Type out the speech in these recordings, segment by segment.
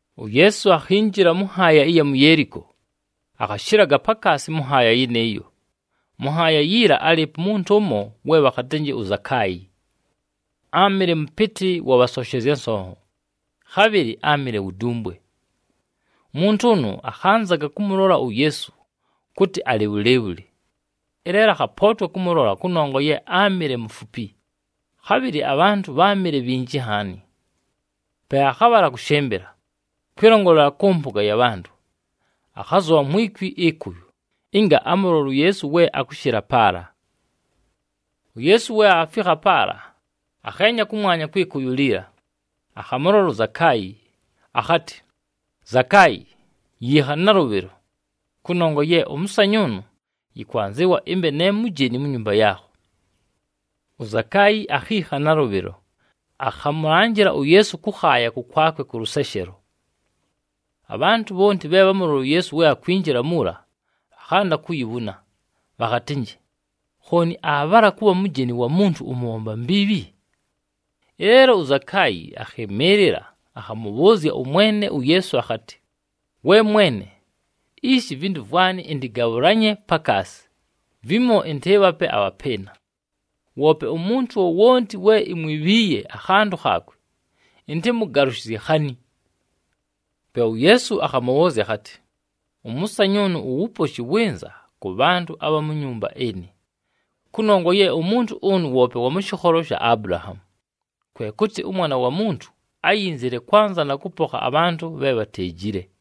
UYeesu akhinjila mʉ nhaaya ɨya mu Yeeliko, akhashɨlaga pakaasi mʉ nhaaya yɨnɨɨyo. Mʉ nhaaya yiila, álɨɨpo umuntu ʉmo, we bhakhatɨnjɨ uZakaayi. Áamɨle mʉpɨtɨ wa bhasonshezya nsonho, khabhɨlɨ áamɨle wu dumbwe. Umuntu ʉnʉ akhanzaga kʉmʉlola uYeesu kʉtɨ alɨ bhʉlɨɨbhʉlɨ, ɨleelo akhapootwa kʉmʉlola kʉnongwa ye áamɨle mufupi, khabhɨlɨ abhantʉ bháamɨle bhinji nhaani. Pe akhabhala akʉshɨmbɨla, kwɨlongolela kʉ mpʉga ya bhantʉ, akhazʉbha mwi kwi ɨkʉyʉ, ɨnga amʉlole uYeesu we akʉshɨla paala. UYeesu we aafikha paala, akheenya kʉmwanya kwɨ kʉyʉ liila, akhamʉlola uZakaayi, akhatɨ, “Zakaayi, yiikha nalʉbhɨlo! Kʉnongwa ye ʉmʉsanyʉʉnʉ yɨkwanzɨwa ɨmbe ne mujeni mu nyumba yaakho.” UZakaayi akhiikha nalʉbhɨlo, akhamʉlanjɨla uYeesu kʉkhaaya kʉkwakwe kʉ lʉseshelo. Abhantʉ bhonti bhe bhámulolile uYeesu we akwinjila muula, bhakhanda kuyibhuna, bhakhatɨnjɨ, “Khooni aabhala kʉbha mujeni wa muntu ʉmʉbhomba mbiibhi!” Ɨleelo uZakaayi akhɨmɨɨlɨla, akhamʉbhʉʉzya ʉMwene uYeesu akhatɨ, “We Mwene! Ishi, ivintu vwanɨ ɨntɨgabhʉlanye pakaasi, vimo ɨntɨɨbhape abhapɨɨna. Woope umuntu wowonti we imwibhiiye akhantʉ khaakwe, ɨntɨmʉgalʉshɨzye khani.” Pe uYeesu akhamʉbhʉʉzya akhatɨ, “Ʉmʉsanyʉʉnʉ, uwuposhi wɨnza kʉ bhantʉ abha mu nyumba ɨnɨ, kʉnongwa ye umuntu ʉnʉ woope wa mʉ shɨkholo sha Abulahaamu. Kwe kʉtɨ, ʉMwana wa Muntu ayinzile kwanza na kʉpokha abhantʉ bhe bhateejile.”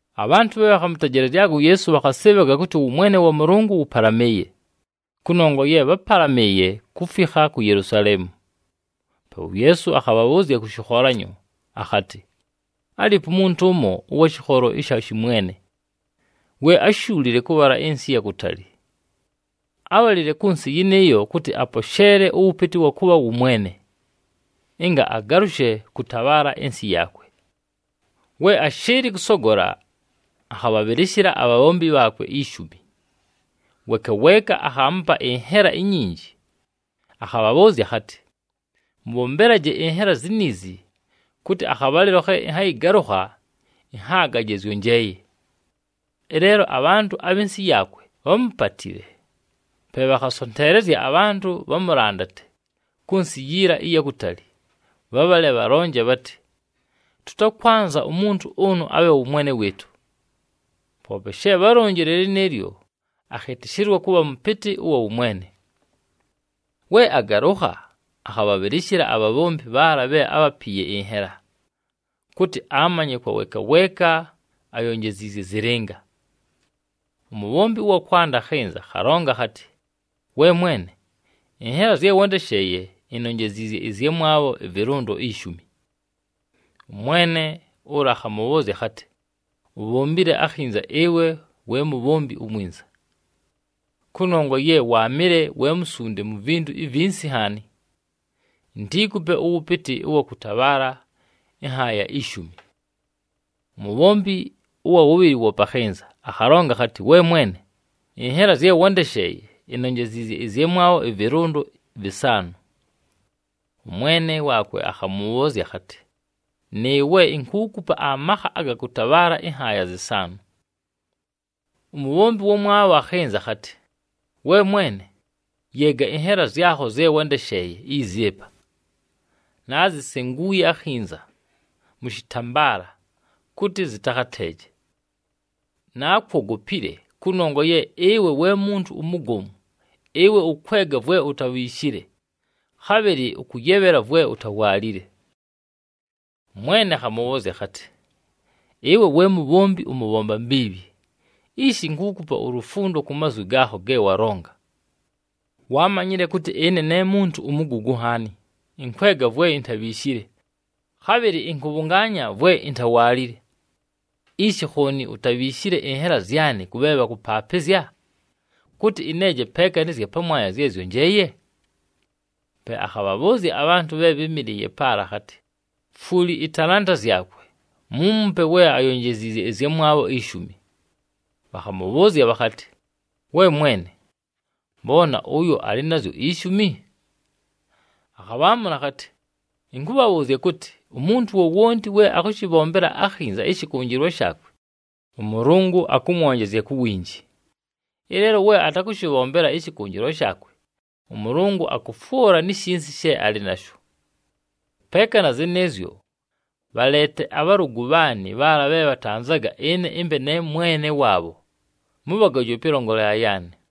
Abhantʉ bhe bhakhamʉtejelezyaga uYeesu bhakhasɨɨbhaga kʉtɨ ʉwʉmwene wa Mʉlʉngʉ wʉpalamɨɨye, kʉnongwa ye bhápalamɨɨye kufikha ku Yelusaleemu. Pe uYeesu akhabhabhʉʉzya kʉ shɨkholanyo akhatɨ, “Álɨɨpo umuntu ʉmo ʉwa mʉ shɨkholo ɨsha shɨmwene, we áshuulile kʉbhala ɨnsɨ ɨya kutali. Ábhalile kʉ nsɨ yɨnɨɨyo kʉtɨ aposheele ʉwʉpɨtɨ ʉwa kʉbha wʉ mwene, ɨnga agalʉshe kʉtabhaala ɨnsɨ yaakwe. “We ashɨɨlɨ kʉsogola, akhabhabhɨlɨshɨla abhabhombi bhaakwe ishumi, weeka weeka akhaamupa ɨnhela inyinji, akhabhabhʉʉzya akhatɨ, ‘Mʉbhombelaje ɨnhela ziniizi kʉtɨ akhabhalɨlo khe ɨnhayɨgalʉkha ɨnhaagaje zyonjeeye.’ Ɨleelo abhantʉ abhɨ nsɨ yaakwe bhámupatile, pe bhakhasonteelezya abhantʉ bhamʉlandate kʉ nsɨ yiila ɨya kutali, bhabhale bhalonje bhatɨ, ‘Tʉtakwanza umuntu ʉnʉ abhe wʉ mwene wɨɨtʉ!’ “Poope she bhálonjile lɨnɨɨlyo, akhɨtɨshɨlwa kʉbha mʉpɨtɨ ʉwa wʉmwene. We agalʉkha, akhabhabhɨlɨshɨla abhabhombi bhaala bhe ábhapiiye ɨnhela, kʉtɨ amanye kwa weeka weeka ayonjeziizye zɨlɨnga. “Umubhombi ʉwa kwanda akhɨnza, akhalonga akhatɨ, ‘We mwene, ɨnhela zye wándesheeye, inonjeziizye ɨzyamwabho ɨvɨlʉndo ishumi.’ Ʉmwene ʉla akhamʉbhʉʉzya akhatɨ, ‘Ubhombile akhinza, ɨwe we mubhombi umwinza. Kʉnongwa ye waamɨle we musunde mu vintu ivinsi nhaani, intiikupe ʉwʉpɨtɨ ʉwa kʉtabhaala ɨnhaaya ishumi.’ Umubhombi ʉwa wʉbhɨlɨ woope akhɨnza, akhalonga akhatɨ, ‘We mwene, ɨnhela zye wándesheeye, inonjeziizye ɨzyamwabho ɨvɨlʉndo vɨsaanʉ.’ Ʉmwene waakwe akhamʉbhʉʉzya akhatɨ, ‘Nɨɨwe, inkuukupa amakha aga kʉtabhaala ɨnhaaya zɨsaanʉ.’ “Umubhombi ʉwamwabho akhɨnza, akhatɨ, ‘We mwene, yeega ɨnhela zyakho zye wándesheeye izi ɨpa. Naazisenguuye akhinza mʉ shɨtambaala, kʉtɨ zɨtakhateeje. Naakwogopile, kʉnongwa ye ɨwe we muntu umugomu. Ɨwe ʉkwega vwe utabhiishile, khabhɨlɨ ʉkʉyebhela vwe utawaalile.’ “Ʉmwene akhamʉbhʉʉzya akhatɨ, ‘Ɨwe we mubhombi ʉmʉbhomba mbiibhi! Ishi, inkuukupa ulufundo ku mazwi gaakho ge walonga. Waamanyile kʉtɨ ɨne ne muntu umugugu nhaani, ɨnkwega vwe intabhiishile, khabhɨlɨ ɨnkʉbhʉngaanya vwe intawaalile. Ishi khooni utabhiishile ɨnhela zyanɨ kʉ bhe bhakʉpaapɨzya, kʉtɨ ɨneeje peeka nɨ zya pamwanya zye zyonjeeye?’ “Pe akhabhabhʉʉzya abhantʉ bhe bhɨ́mɨlɨɨye paala, akhatɨ, ‘Fwuli ɨtalanta zyakwe, muumupe we ayonjeziizye ɨzyamwabho ishumi.’ Bhakhamʉbhʉʉzya bhakhatɨ, ‘We mwene, mbona ʉyo alɨ nazyo ishumi!’ “Akhabhaamʉla akhatɨ, ‘Ɨnkʉbhabhʉʉzya kʉtɨ, umuntu wowonti we akʉshɨbhombela akhinza ɨshɨkʉnjɨlwa shaakwe, ʉMʉlʉngʉ akʉmwonjezya ku winji. Ɨleelo we atakʉshɨbhombela ɨshɨkʉnjɨlwa shaakwe, ʉMʉlʉngʉ akʉfwʉla ni shinsi she alɨ nasho. Peeka na zɨnɨɨzyo, bhaleete abhalʉgʉ bhaanɨ bhaala bhe bhatanzaga ɨne ɨmbe ne mwene waabho, mʉbhagoje pɨlongolela yaanɨ!’”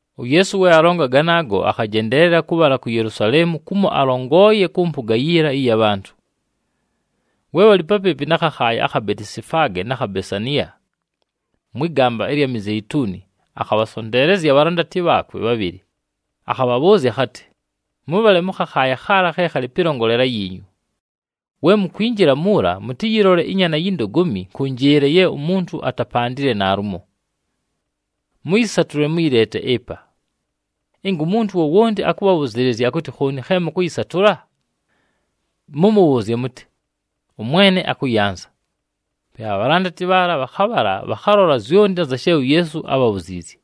UYeesu we alonga ganaago, akhajendeelela kʉbhala ku Yelusaleemu kumo alongoleeye kʉ mpʉga yiila ɨya bhantʉ. We alɨ papɨɨpɨ na khakhaaya akha Betisifaage na kha Besaniya, mwɨ gamba ɨlya Mizeituni, akhabhasonteelezya abhalandati bhaakwe bhabhɨlɨ, akhabhabhʉʉzya akhatɨ, “Mʉbhale mʉ khakhaaya khaala khe khalɨ pɨlongolela yiinyu. We mukwinjila muula, mʉtɨyɨlole ɨnyaana yi ndogomi nkʉnjɨɨle ye umuntu atapandile naalumo. Mʉyɨsatʉle, mʉyɨleete ɨpa. Ɨnga umuntu wowonti akʉbhabhʉzɨɨlɨzya akʉtɨ, ‘Khooni khe mʉkʉyɨsatʉla?’ mʉmʉbhʉʉzye mʉtɨ, ‘ɄMwene akʉyanza.’” Pe abhalandati bhaala bhakhabhala, bhakhalola zyonti anza she uYeesu ábhabhuziizye.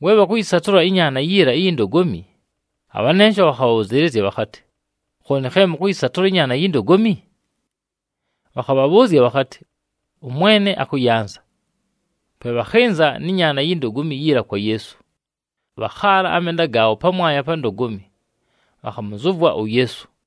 We bhakʉyɨsatʉla ɨnyaana yiila iyi ndogomi, abhanensho bhakhabhabhʉzɨɨlɨzya bhakhatɨ, “Khooni khe mʉkʉyɨsatʉla ɨnyaana yi ndogomi?” Bhakhabhabhʉʉzya bhakhatɨ, “ɄMwene akʉyanza.” Pe bhakhɨnza nɨ nyaana yi ndogomi yiila kwa Yeesu, bhakhaala amenda gaabho pamwanya pa ndogomi, bhakhamʉzʉvwa uYeesu.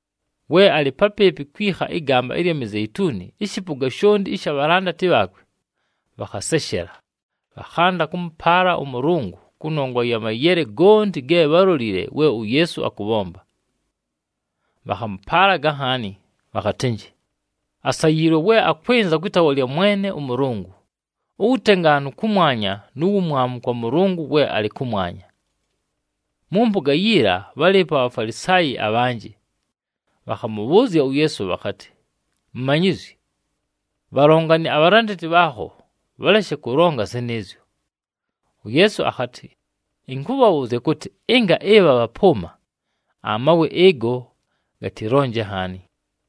We alɨ papɨɨpɨ kwikha ɨgamba ɨlya Mizeituni, ɨshɨpʉga shonti ɨsha bhalandati bhaakwe bhakhaseshela, bhakhanda kʉmʉpaala ʉMʉlʉngʉ kʉnongwa ya mayele gonti ge bhálolile we uYeesu akʉbhomba. Bhakhamʉpaalaga nhaani bhakhatɨnjɨ, “Asayiilwe we akwɨnza kwɨ taawa lya Mwene ʉMʉlʉngʉ! Uwutengaanu kʉmwanya nu wumwamu kwa Mʉlʉngʉ we alɨ kʉmwanya.” Mʉ mpʉga yiila, bhálɨɨpo aBhafalisaayi abhanjɨ, bhakhamʉbhʉʉzya uYeesu bhakhatɨ, “Mumanyizyi, bhalongane abhalandati bhaakho, bhaleshe kʉlonga zɨnɨɨzyo!” UYeesu akhatɨ, “Ɨnkʉbhabhʉʉzya kʉtɨ, ɨnga ɨbha bhapʉʉma, amawe ɨgo gatɨlonje nhaani!”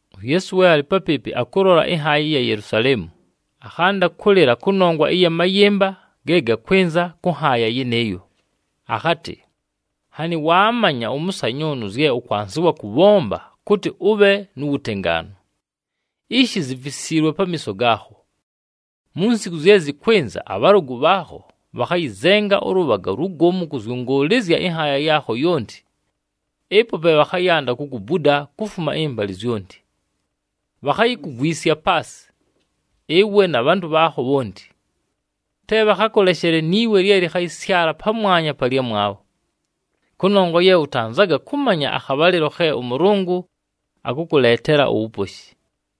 UYeesu we alɨ papɨɨpɨ, akʉlola ɨnhaaya ɨya Yelusaleemu, akhanda kʉlɨla kʉnongwa ɨya mayɨmba ge gakwɨnza kʉ nhaaya yɨnɨɨyo, akhatɨ, “Nhanɨ waamanya ʉmʉsanyʉʉnʉ zye ʉkwanzɨwa kʉbhomba kʉtɨ ʉbhe nu wutengaanu! Ishi zifisiilwe pamiiso gaakho. Mu nsiku zye zɨkwɨnza, abhalʉgʉ bhaakho bhakhayɨzenga ʉlʉbhaga ulugomu kʉzyʉngʉʉlɨzya ɨnhaaya yaakho yonti, ɨpo pe bhakhayanda kukubuda kufuma ɨmbalɨ zyonti. Bhakhayikugwisya paasɨ, ɨwe na bhantʉ bhaakho bhonti. Te bhakhakʉleshele ni we lye lɨkhayɨsyala pamwanya pa lyamwabho, kʉnongwa ye ʉtanzaga kʉmanya akhabhalɨlo khe ʉMʉlʉngʉ akʉkʉleetela uwuposhi!”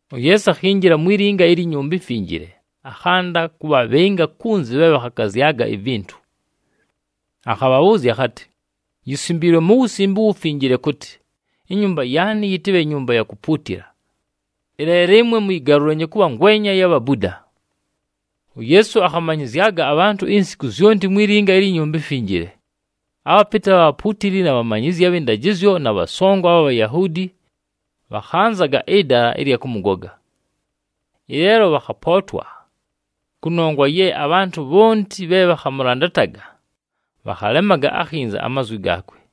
UYeesu akhinjila mwi linga ilyi Nyumba iMfinjile, akhanda kʉbhabhɨnjɨla kunzi bhe bhakhakazyaga ivintu. Akhabhabhʉʉzya akhatɨ, “Yisimbiilwe mu Wusimbe uWufinjile kʉtɨ, ‘Inyumba yaanɨ, yɨtɨbhe nyumba ya kupuutila.’ Ɨleelo ɨmwe, muyigalulanyiinye kʉbha ngwenya ya bhabuda!” UYeesu akhamanyɨzyaga abhantʉ insiku zyonti mwi linga ilyi Nyumba iMfinjile. Abhapɨtɨ abha bhapuutili, na bhamanyizyi abhɨ ndajɨzyo na bhasongo abha Bhayahuudi, bhakhanzaga ɨdala ɨlya kʉmʉgoga. Ɨleelo bhakhapootwa, kʉnongwa ye abhantʉ bhonti bhe bhakhamʉlandataga bhakhalemaga akhinza amazwi gaakwe.